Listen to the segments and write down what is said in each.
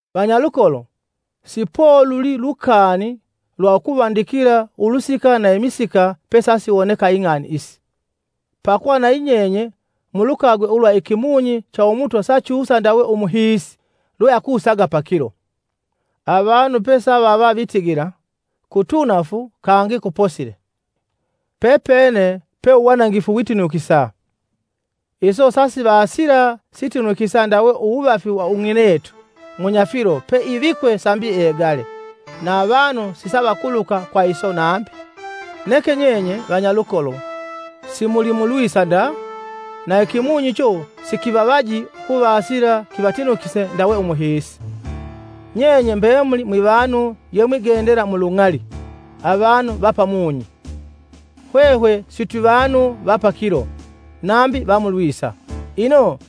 Vanyalukolo, si poluli lukani lwa ukuvandikila ulusika na imisika pesasiwoneka ing'ani isi. Pakuva nayi nyenye mulukagwe ulwa ikimunyi cha Umutwa sachusa ndawe umuhiisi lwe akusaga pakilo. Avanu pesava vitigila, “Kitunafu kangi kuposile.” Pepene pe uwanangifu witinukisa! Iso sasivasila sitinukisa ndawe uwuvafi wa ung'inetu munyafilo peivikwe sambi egale, na avanu sisavakuluka kwa iso nambi, neke nyenye, vanyalukolo, simuli mulwisa nda, na ikimunyi icho sikivavaji ukuvasila kivatinukise ndawe umuhiisi. Nyenye mbemuli mwivanu ye mwigendela mu lung'ali, avanu va pamunyi. Hwehwe sitwi vanu va pakilo, nambi va mu lwisa. Ino,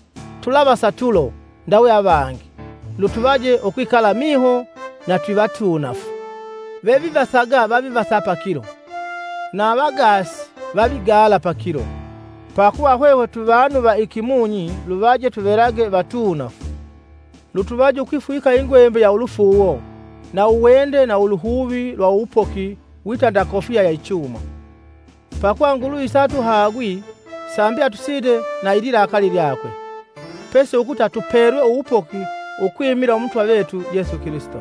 tulavasa tulo ndawe avangi, lutuvaje ukwikala miho na twivatuunafu. Vevivasaga vavivasa pakilo, na avagaasi vavigala pakilo. Pakuva hwehwe twivanu va ikimunyi luvaje tuvelage vatuunafu, lutuvaje ukwifwika ingwembe ya ulufuuwo na uwende na uluhuvi lwa uwupoki wita nda kofiya ya ichuma. Pakuva Nguluvi satuhagwi sambi atusinde na ililakali lyakwe, pesi ukuta tupelwe uwupoki ukwimila Umutwa vetu Yesu Kilisito,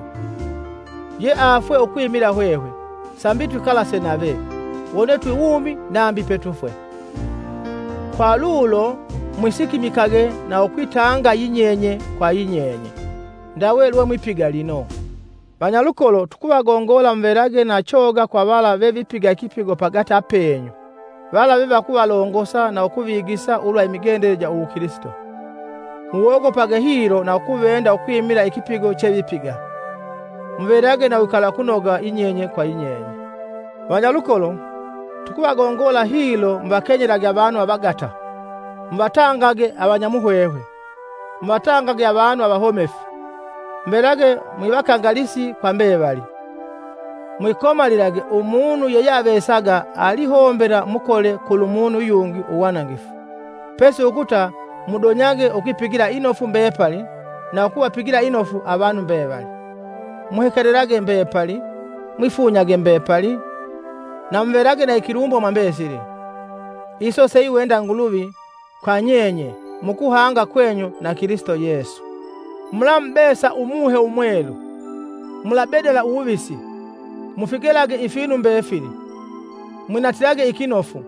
Ye afwee ukwimila hwehwe, sambi twikalase nave, wone twiwumi nambi petufwe. kwa lulo mwisikimikage na ukwitanga yinyenye kwa yinyenye, ndawe lwe mwipiga lino. Vanyalukolo, tukuvagongola muvelage na choga kwa vala vevipiga ikipigo pagati apeenyu, vala vevakuvalongosa na ukuvigisa ulwa imigendele ja uwukilisito. Muwogopage hilo na ukuvenda ukwimila ikipigo chevipiga. Muvelage na uwikalakunoga yinyenye kwa yinyeye. Vanyalukolo, tukuvagongola hilo muvakenyelage avanu avagata, muvatangage avanyamuhwehwe, muvatangage avanu avahomefu, muvelage mwivakangalisi kwa mbevali. Mwikomalilage umunu yeyeavesaga alihombela mukole kulumunu yungi uwanangifu, pesi ukuta mudonyage ukwipigila inofu mbepali na ukuvapigila inofu avanu mbevali. Muhekelelage mbepali, mwifunyage mbepali, na muvelage na ikilumbo mwa mbesili. Iso seiwenda Nguluvi kwa nyenye mukuhanga kwenyu na Kilisito Yesu. Mulamubesa Umuhe Umwelu; Mulabedala uwuvisi, Mufigelage ifinu mbefili: mwinatilage ikinofu,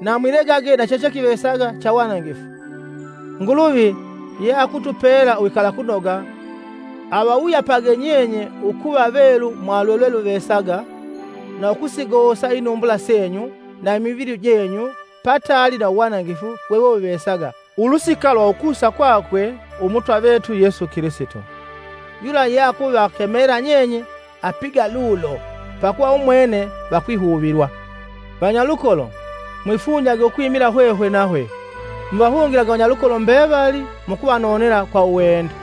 na mwilegage na chechekivesaga chawanangifu, Nguluvi ye akutupela uwikalakunoga—avawuyapage nyenye ukuva velu kwa lwelweluvesaga na ukusigosa inumbula senyu, na imivili jenyu pataali na uwanangifu wewewuvesaga ulusika lwa ukusa kwakwe Umutwa vetu Yetu Kilisito. Yula yeakuvakemela nyenye apiga lulo pakuva umwene va kwihuvilwa. Vanyalukolo, mwifunyage ukwimila hwehwe nahwe. Muvahungilage vanyalukolo mbevali mukuvanonela kwa uwende.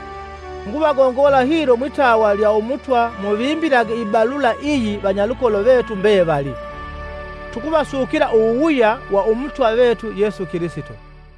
Nguvagongola hilo mwitawa lya Umutwa muvimbilage ibalula iyi vanyalukolo vetu mbevali. Tukuvasukila uwuwuya wa Umutwa vetu Yesu Kilisito.